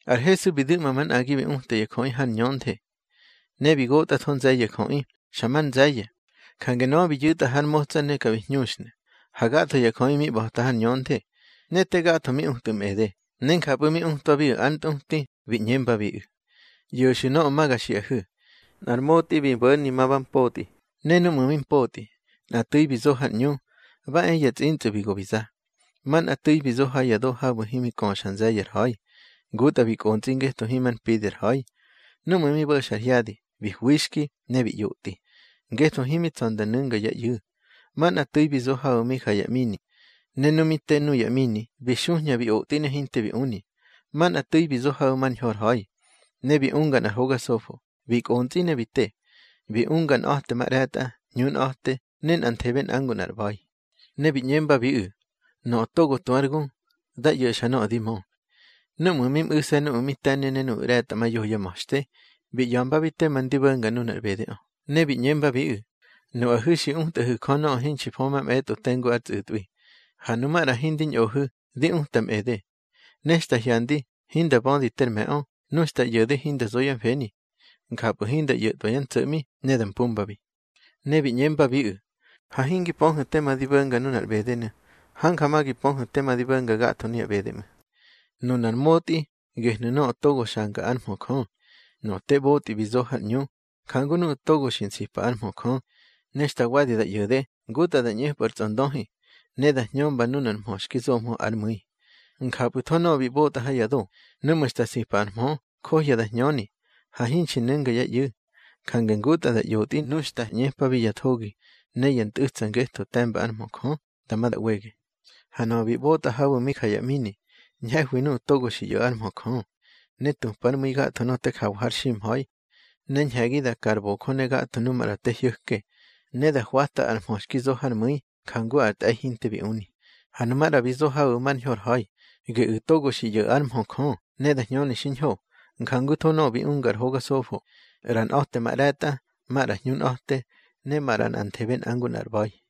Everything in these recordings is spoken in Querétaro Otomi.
Ar Hesu bi du̱ꞌma manꞌagi bi uta ya jöꞌi har ñönthe. Ne bi gotꞌatho nze̱ye̱ ya jöꞌi, xa mar nze̱ye̱. Jange nöꞌö bi yu̱tꞌa har motsa ne ka bi hñuxnu̱, ha gatho ya jöꞌi mi ꞌba̱ta har ñönthe. Ne te gatho mi utꞌu̱ mꞌede, ne njapꞌu̱ mi utwabiꞌu̱ ár ntꞌuti, bi ꞌñembabiꞌu̱: —ꞌYo̱xu̱ nöꞌö ma ga xiꞌahu̱: Nꞌar motꞌi bi bo̱ni ma ba mpotꞌi. Ne núꞌmu̱ mi mpotꞌi, nꞌa tu̱i bi zo har ꞌñu, ba e ya tsꞌintsꞌu̱ bi go bi za. Manꞌa tu̱i bi zo ha ya do habu̱ himi köxa nze̱ye̱ ar ha̱i. Ngutꞌa bi kꞌontsꞌi ngetho himar mpidi ar ha̱i. Núꞌmu̱ mi bo̱xa ar hyadi, bi hwixki, ne bi ꞌyotꞌi, ngetho himi tsa̱ nda nu̱nga yá ꞌyu̱. Manꞌa tu̱i bi zo habu̱ mi ja ya ꞌmini. Ne nu mi te nuya ꞌmini, bi xuhña bi otꞌi ne hinte bi uni. Manꞌa tu̱i bi zo habu̱ mar ñho ar ha̱i, ne bi unga nꞌar hoga sofo, bi kꞌontsꞌi ne bi te. Bi unga nꞌa̱temaꞌre̱tꞌa, hñunꞌa̱te ne nꞌanthebe nꞌa ngu nꞌa ar ꞌba̱i. Ne bi ꞌñembabiꞌu̱: —Nöꞌö togo tu ár gu, dá ꞌyo̱xa nöꞌö di mö. Núꞌmu̱ mi mꞌu̱se̱ nuꞌu̱ mi te̱ni ne nuꞌu̱ ꞌre̱tꞌamayoho yá ma̱xte, bi ꞌya̱mbabi tema ndi bo̱nga nunar ꞌbedeꞌö. Ne bi ꞌñembabiꞌu̱: —Nuꞌahu̱ xi utꞌahu̱ Jö nöꞌö hinxi fö mamꞌe̱tꞌo tengu ár tsꞌu̱tꞌwi, ha nu maꞌra hindi ñꞌohu̱, di utamꞌede. Ne xta hyandi, hinda bödi ter me̱ꞌö, nu xta ꞌyo̱de hinda zo yá mfeni, njapꞌu̱ hinda ꞌyo̱tꞌwa yá ntso̱ꞌmi, ne da mpumbabi. Ne bi ꞌñembabiꞌu̱: —Ha hingi pöhu̱ tema di bo̱nga nunar ꞌbedenu̱. Hanja ma gi pöhu̱ tema di bo̱nga gatho nuya ꞌbede ꞌmu̱. Nunar motꞌi, gehnu̱ nöꞌö togo xanga ár mhö Jö. Nöꞌö te ꞌbotꞌi bi zo har ꞌñu, njangu nuꞌu̱ togo xi nsipa ár mhö Jö. Ne xta wadi da ꞌyo̱de, ngutꞌa da ꞌñepꞌu̱ ar tsꞌondöhi, ne da hñömba nunar mhö xki zomhö ár mu̱i. Njapꞌu̱tho nöꞌö bi ꞌbotꞌa ha ya do, núꞌmu̱ xta nsipa ar mhö, njohya da hñöni. Ha hinxi nu̱nga yá ꞌyu̱, jange ngutꞌa da ꞌyotꞌi nu xta ꞌñepabi ya thogi ne ya ntꞌu̱tsa ngetho te̱mba ár mhö Jö, dama da ꞌwege. Ha nöꞌö bi ꞌbotꞌa habu̱ mi ja ya ꞌmini, ñhe̱hwi nuꞌu̱ togo xi ꞌyo̱ ár mhö Jö, ne tupár mu̱i gatho nöꞌö te jawa har ximha̱i. Ne ñhe̱gi da ka ar bojö ne gatho nu maꞌra te hyo̱ke, ne da hwata ar mhö xki zo hár mu̱i, njangu ar tꞌe̱i hinte bi uni. Ha nu maꞌra bi zo habu̱ mar ñho ar ha̱i. Geꞌu̱ togo xi ꞌyo̱ ár mhö Jö, ne da hñöni xiñho, njangutho nuꞌu̱ bi unga ar hoga sofo, ꞌra nꞌa̱temaꞌre̱tꞌa, maꞌra hñunꞌa̱te, ne maꞌra nꞌanthebe nꞌa ngu nꞌar ꞌba̱i.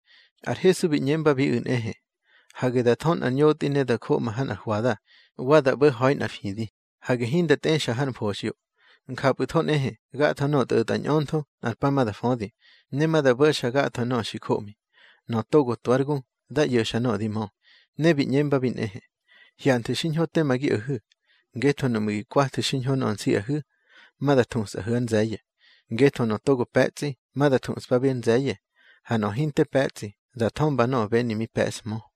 Ar Hesu bi ꞌñembabiꞌu̱ nꞌehe: —Hage da thö nꞌar ñotꞌi ne da joꞌma ha nꞌar hwada, wa da ꞌbo̱ ha̱i nꞌar fidi. Hage hinda tꞌexa har mfoxꞌyo. Njapꞌu̱tho nꞌehe, gatho nöꞌö tꞌo̱tꞌa ñꞌöntho, nꞌar pa ma da födi, ne ma da bo̱xa gatho nöꞌö xi joꞌmi. Nöꞌö togo tu ár gu, dá ꞌyo̱xa nöꞌö di mö. Ne bi ꞌñembabi nꞌehe: —Hyanthu̱ xiñho tema gi o̱hu̱, ngetho nuꞌmu̱ gi kwathu̱ xiñho nöꞌö nsiꞌahu̱, ma da thusꞌahu̱ ár nze̱ye̱. Ngetho nöꞌö togo pe̱tsꞌi, ma da thuꞌspabi ár nze̱ye̱, ha nöꞌö hinte pe̱tsꞌi, da thömba nöꞌö beni mi pe̱ꞌshmö.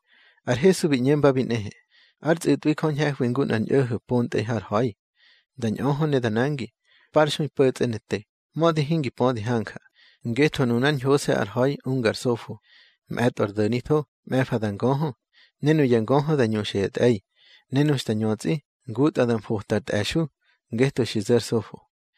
Ar Hesu bi ꞌñembabi nꞌehe: —Ár tsꞌu̱tꞌwi Jö ñhe̱hwi ngu nꞌar ñꞌo̱ho̱ pontꞌe̱i har ha̱i. Da ñꞌöhö ne da nangi, parxui po̱tsꞌe ne te, mödi hingi pödi hanja. Ngetho nunár ñhose̱ ar ha̱i unga ar sofo: mꞌe̱tꞌo ar do̱nitho, mꞌe̱fa da ngöhö, ne nuya ngöhö da ñuxa ya tꞌe̱i. Ne nu xta ñötsꞌi, ngutꞌa da mfota ar tꞌe̱xu̱, ngetho xi zo̱ ar sofo.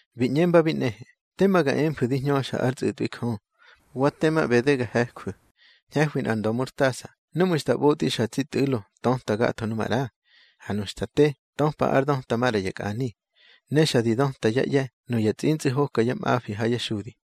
Bi ꞌñembabi nꞌehe: —Tema ga emfu̱ di hñöxa ár tsꞌu̱tꞌwi Jö, wa tema ꞌbede ga he̱jwu̱. Ñhe̱hwi nꞌar nda̱murtasa, nuꞌmu̱ xta ꞌbotꞌi xa tsi tꞌu̱lo, töta gatho nu maꞌra. Ha nu xta te, töpa ár döta maꞌra ya kꞌani. Ne xa di döta yá ꞌye̱, nuya tsꞌintsꞌu̱ hokyá mꞌafi ha yá xudi.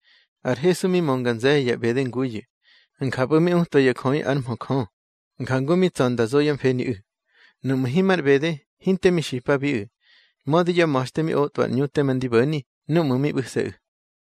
Ar Hesu mi mönga nze̱ye̱ ya ꞌbede nguyu̱. Njapꞌu̱ mi utwa ya jöꞌi ár mhö Jö, njangu mi tsa̱ nda zo yá mfeniꞌu̱. Nuꞌmu̱ himar ꞌbede, hinte mi xipabiꞌu̱, mödi yá ma̱xte mi otꞌwa ar ꞌñu tema ndi bo̱ni, núꞌmu̱ mi ꞌbu̱se̱ꞌu̱.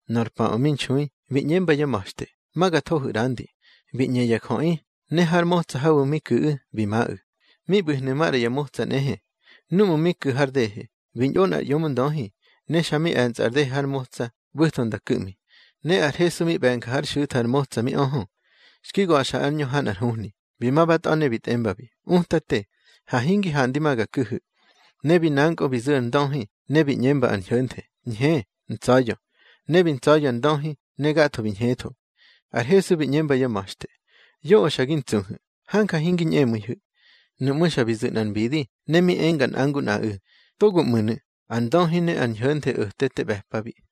Nor paꞌö mi nxui, bi ꞌñemba yá ma̱xte: —Ma ga thohu̱ ꞌrandi. Bi ꞌñe ya jöꞌi, ne har motsa habu̱ mi ku̱ꞌu̱, bi maꞌu̱. Mi ꞌbu̱hnu̱ maꞌra ya motsa nꞌehe. Núꞌmu̱ mi ku̱ har dehe, bi ñꞌo nꞌar ꞌyomndöhi, ne xa mi e̱nsa ar dehe har motsa, ꞌbu̱tho nda ku̱ꞌmi. Ne ar Hesu mi ꞌbe̱nga hár xu̱tha ar motsa mi öhö, xki ga̱xa ár ñö ha nꞌar huhni. Bi ma ba tꞌa̱, ne bi tꞌembabi: —Utate, ha hingi handi ma ga ku̱hu̱. Ne bi nankꞌö bi zu̱ ar ndöhi, ne bi ꞌñemba ar ñho̱nthe: —Ñhe, ntsa̱ya̱. Ne bi ntsa̱ya̱ ar ndöhi, ne gatho bi ñhetho. Ar Hesu bi ꞌñemba yá ma̱xte: —Yoꞌö xa gi ntsuhu̱. Hanja hingi ñꞌemu̱ihu̱. Nuꞌmú̱ xa bi zu̱ nꞌar mbidi, ne mi enga nꞌa ngu nꞌaꞌu̱: —Togoꞌmu̱nu̱. Ar ndöhi ne ar ñho̱nthe o̱te te ꞌbe̱pabi.